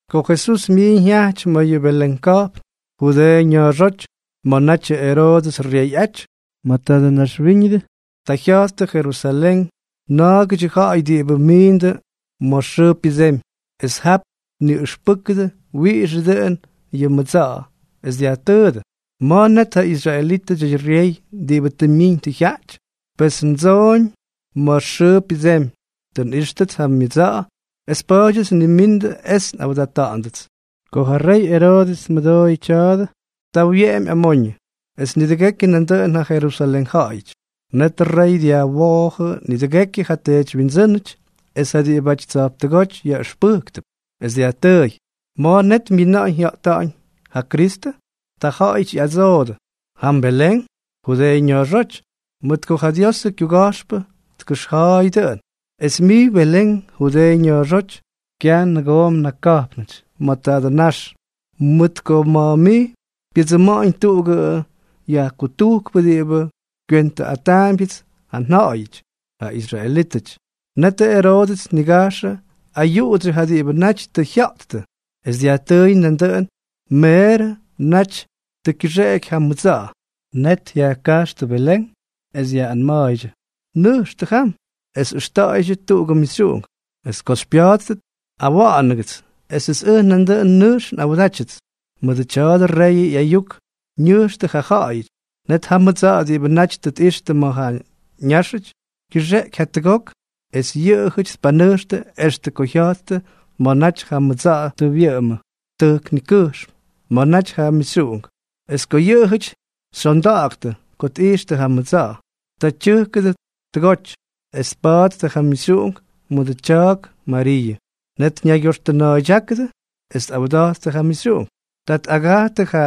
Ko Jesús myiiñ jyajty ma̱ yʉ Belén ka̱jpn, Judeeʉ ña̱a̱xóty, ma̱ natyʉ Eroodʉs ryeyꞌaty ma̱ tadʉ naxwíñʉdʉ, ta jya̱jttʉ Jerusalén na̱a̱gʉdyʉ ja̱ꞌa̱y diꞌibʉ miindʉ ma̱ xʉʉ pyʉdsemy, es jap tniꞌʉxpʉ́kʉdʉ wiꞌixʉ dʉꞌʉn yʉ mʉdsa̱ꞌa̱. Es dyajtʉʉdʉ: —¿Ma̱a̱ net ja israelítʉdyʉ ryey diꞌibʉ tʉ myiñ tʉ jyaꞌty? Pes ndsooñ ma̱ xʉʉ pyʉdsemy. Tʉ nꞌíxtʉts ja myʉdsa̱ꞌa̱ es pa̱a̱dyʉts nnimindʉ es nꞌawdata̱ꞌa̱ndʉts. Ko ja rey Eroodʉs tmʉdooyʉ tya̱a̱dʉ, ta wyeꞌemy amoñʉ, es nidʉgekyʉ nandʉꞌʉn ja Jerusalén ja̱ꞌa̱yʉty. Netʉ rey dyajwoojʉ nidʉgekyʉ ja teedywyindsʉ́nʉty es ja diꞌibʉty tsa̱jptʉgóty yaꞌʉxpʉjktʉp, es dyajtʉʉy: —¿Ma̱a̱ net myina̱ꞌa̱ñ jya̱ꞌta̱ꞌa̱ñ ja Kristʉ? Ta jaꞌajʉty ꞌyadsoodʉ: —Jam Belén, Judeeʉ ña̱a̱xóty; mʉt ko ja Diosʉ kyuga̱jxpʉ tkʉxja̱a̱y dʉꞌʉn: Es mij Belén, Judeeʉ ña̱a̱xóty, kyaj mnʉgooga̱jpnʉty ma̱ tadʉ nax, mʉt ko ma̱ mij pyʉdsʉma̱ꞌa̱ñ tuꞌugʉ yajkutujkpʉ diꞌibʉ kywentʉꞌataambyʉts ja nja̱ꞌa̱yʉty, ja israelítʉty. Netʉ Eroodʉs tnigajxʉ ayuꞌudsyʉ ja diꞌibʉ naty tʉ jya̱ꞌttʉ, es dyajtʉʉy na̱ꞌa̱ dʉꞌʉn meerʉ naty tʉ kyʉxeꞌeky ja mʉdsa̱ꞌa̱. Net yajkajxtʉ Belén, es yaꞌꞌanma̱a̱ydyʉ: —Nʉjxtʉ jam, es ʉxta̱ꞌa̱ydyʉ tadʉ mixyuꞌunk; es ko xypya̱a̱ttʉt, awa̱ꞌa̱nʉgʉts esʉts ʉj nandʉꞌʉn nʉjx nꞌawdátyʉts. Mʉdʉ tya̱dʉ reyʉ ꞌyayuk ñʉjxtʉ ja ja̱ꞌa̱yʉty. Net ja mʉdsa̱ꞌa̱ diꞌibʉ naty tʉ tꞌixtʉ ma̱ ja ñáxʉty, kyʉxeꞌky jatʉgok, es yʉꞌʉjʉty tpanʉjxtʉ extʉ ko jya̱jttʉ ma̱ naty ja mʉdsa̱ꞌa̱ tʉ wyʉꞌʉmʉ tʉjk nikʉjxm ma̱ naty ja mixyuꞌunk. Es yʉꞌʉjʉty xyondaktʉ ko tꞌijxtʉ ja mʉdsa̱ꞌa̱. Ta tyʉjkʉdʉ tʉgoty, es tpattʉ ja mixyuꞌunk mʉdʉ tya̱a̱k Mariiʉ. Net ñaygyoxtʉna̱a̱ydyákʉdʉ es tꞌawda̱jttʉ ja mixyuꞌunk. Ta tꞌagajtʉ ja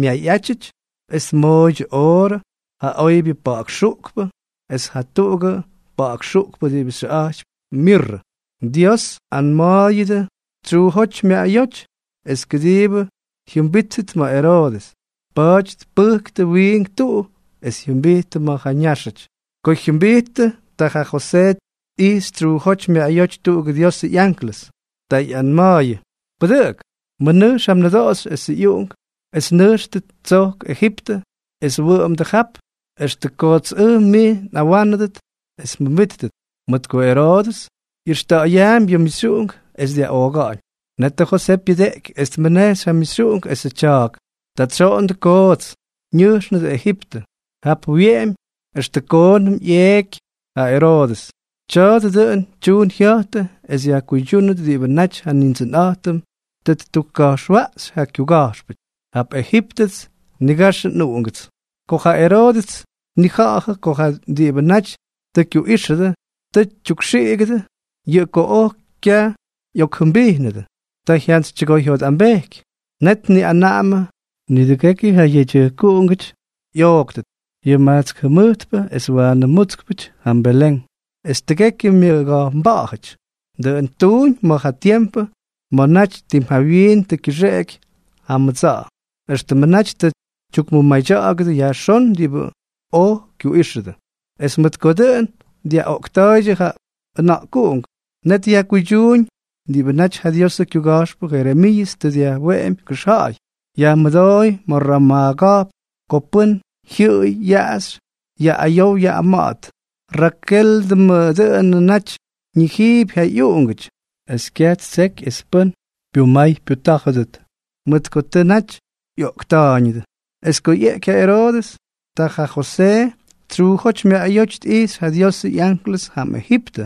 myayꞌátyʉty es tmooydyʉ oorʉ, ja oybyʉ pa̱ꞌa̱k xuꞌkpʉ es jatuꞌugʉ pa̱ꞌa̱k xuꞌkpʉ diꞌibʉ xyʉꞌa̱jtypy mirrʉ. Dios anma̱a̱yʉdʉ tsyuujóty myaꞌayóty es kʉdiibʉ jyʉmbíttʉt ma̱ Eroodʉs, pa̱a̱ty tpʉjktʉ wiink tuꞌu es jyʉmbijttʉ ma̱ ja ñáxʉty. Ko tya̱a̱dʉ jyʉmbijttʉ, ta ja Josee tꞌijxy tsyuujóty myaꞌayóty tuꞌugʉ Diosʉ ꞌyanklʉs. Ta ꞌyanma̱a̱yʉ: —Pʉdʉꞌʉk. Mʉnʉjx ja mnʉdoꞌoxy esʉ ꞌyuꞌunk, es nʉjxtʉ tsojk Ejiptʉ es wʉꞌʉmdʉ jap extʉ kots ʉj mij nꞌawánʉdʉt es mjʉmbíttʉt, mʉt ko Eroodʉs ꞌyʉxta̱ꞌa̱yaampy yʉ mixyuꞌunk es dyaꞌooga̱ꞌa̱ñ. Netʉ Josee pyʉdeꞌky es tmʉnejxy ja mixyuꞌunk esʉ tya̱a̱k. Ta tsyoꞌondʉ koots, ñʉjxnʉdʉ Ejiptʉ. Jap wyeꞌemy extʉ koonʉm ꞌyeꞌky ja Eroodʉs. Tya̱a̱dʉ dʉꞌʉn tyuun jya̱jtʉ es yajkuydyúnʉt diꞌibʉ naty ja Nindsʉnꞌa̱jtʉm tʉ ttukka̱jxwaꞌxy ja kyuga̱jxpʉty: “Jap Ejíptʉts nnigaxʉ nꞌUꞌungʉts.” Ko ja Eroodʉs tnija̱ꞌa̱jʉ ko ja diꞌibʉ naty tʉ kyuꞌíxʉdʉ tʉ tyukxiꞌigʉdʉ, yʉꞌʉ ko oj kyaj ꞌyokjʉmbijnʉdʉ, ta jyantsytyʉgoyjyotꞌambejky. Net tniꞌanaꞌamʉ nidʉgekyʉ ja yedyʉjkuꞌungʉty ꞌyooktʉt, yʉ majtsk jʉmʉjtpʉ es waanʉ mútskpʉty, jam Belén es tʉgekyʉ myʉga̱jpnba̱ꞌa̱jʉty. Dʉꞌʉn ttuuñ ma̱ ja tiempʉ ma̱ naty tim jawyiin tʉ kyʉxeꞌeky ja mʉdsa̱ꞌa̱, éxtʉmʉ naty tʉ tyukmʉmadya̱ꞌa̱gʉdʉ yajxón diꞌibʉ oj kyuꞌíxʉdʉ. Es mʉt ko dʉꞌʉn dyaꞌoꞌkta̱a̱ydyʉ ja ʉna̱ꞌkuꞌunk, net yajkuydyuuñ diꞌibʉ naty ja Diosʉ kyuga̱jxpʉ Jeremiiʉs tʉ dyajweꞌemy kʉxja̱ꞌa̱y: Yajmʉdooy ma̱ Ramaa ka̱jpn ko pʉ́n jyʉꞌʉy yaꞌaxy yaꞌꞌayow yaꞌꞌama̱ꞌa̱t. Rakéldʉmʉ dʉꞌʉnʉ naty ñijiipy ja ꞌyuꞌungʉty es kyaj ttseky es pʉ́n pyumay pyutá̱jʉdʉt mʉt ko tʉ naty ꞌyoꞌkta̱a̱yñʉdʉ. Es ko ꞌyeꞌky ja Eroodʉs, ta ja Josee tsyuujóty myaꞌayóty tꞌijxy ja Diosʉ ꞌyanklʉs jam Ejiptʉ,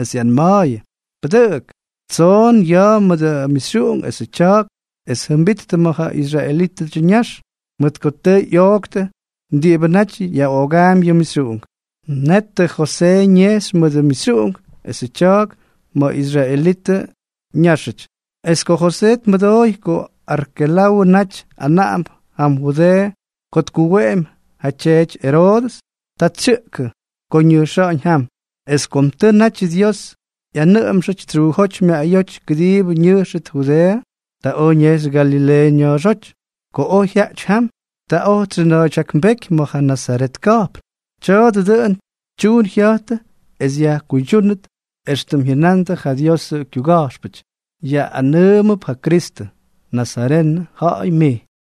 es ꞌyanma̱a̱yʉ: —Pʉdʉꞌʉk. Tsoon ya̱a̱ mʉdʉ mixyuꞌunk esʉ tya̱a̱k, es jʉmbittʉ ma̱ ja israelítʉdyʉ ñax, mʉt ko tʉ ꞌyooktʉ diꞌibʉ naty yaꞌoogaampy yʉ mixyuꞌunk. Netʉ Josee ñejxy mʉdʉ mixyuꞌunk esʉ tya̱a̱k ma̱ israelitʉ ñáxʉty. Es ko Josee tmʉdooy ko Arkelawʉ naty anaꞌamp jam Judeeʉ ko tkuweꞌemy ja tyeety Eroodʉs, ta tsyʉꞌkʉ ko ñʉjxáñ jam. Es kom tʉ natyʉ Dios ꞌyanʉꞌʉmxʉty tsyuujóty myaꞌayóty kʉdiibʉ ñʉjxʉt Judeeʉ, ta oj ñejxy Galileeʉ ña̱a̱xóty. Ko oj jyaꞌty jam, ta oj tsyʉna̱a̱ydyaknbéky ma̱ ja Nazaret ka̱jpn. Tya̱a̱dʉ dʉꞌʉn tyuun jya̱jtʉ es yajkuydyúnʉt éxtʉm jyʉnandʉ ja Diosʉ kyuga̱jxpʉty: “Yaꞌꞌanʉʉmʉp ja Kristʉ: Nazarenʉ ja̱ꞌa̱y mij.”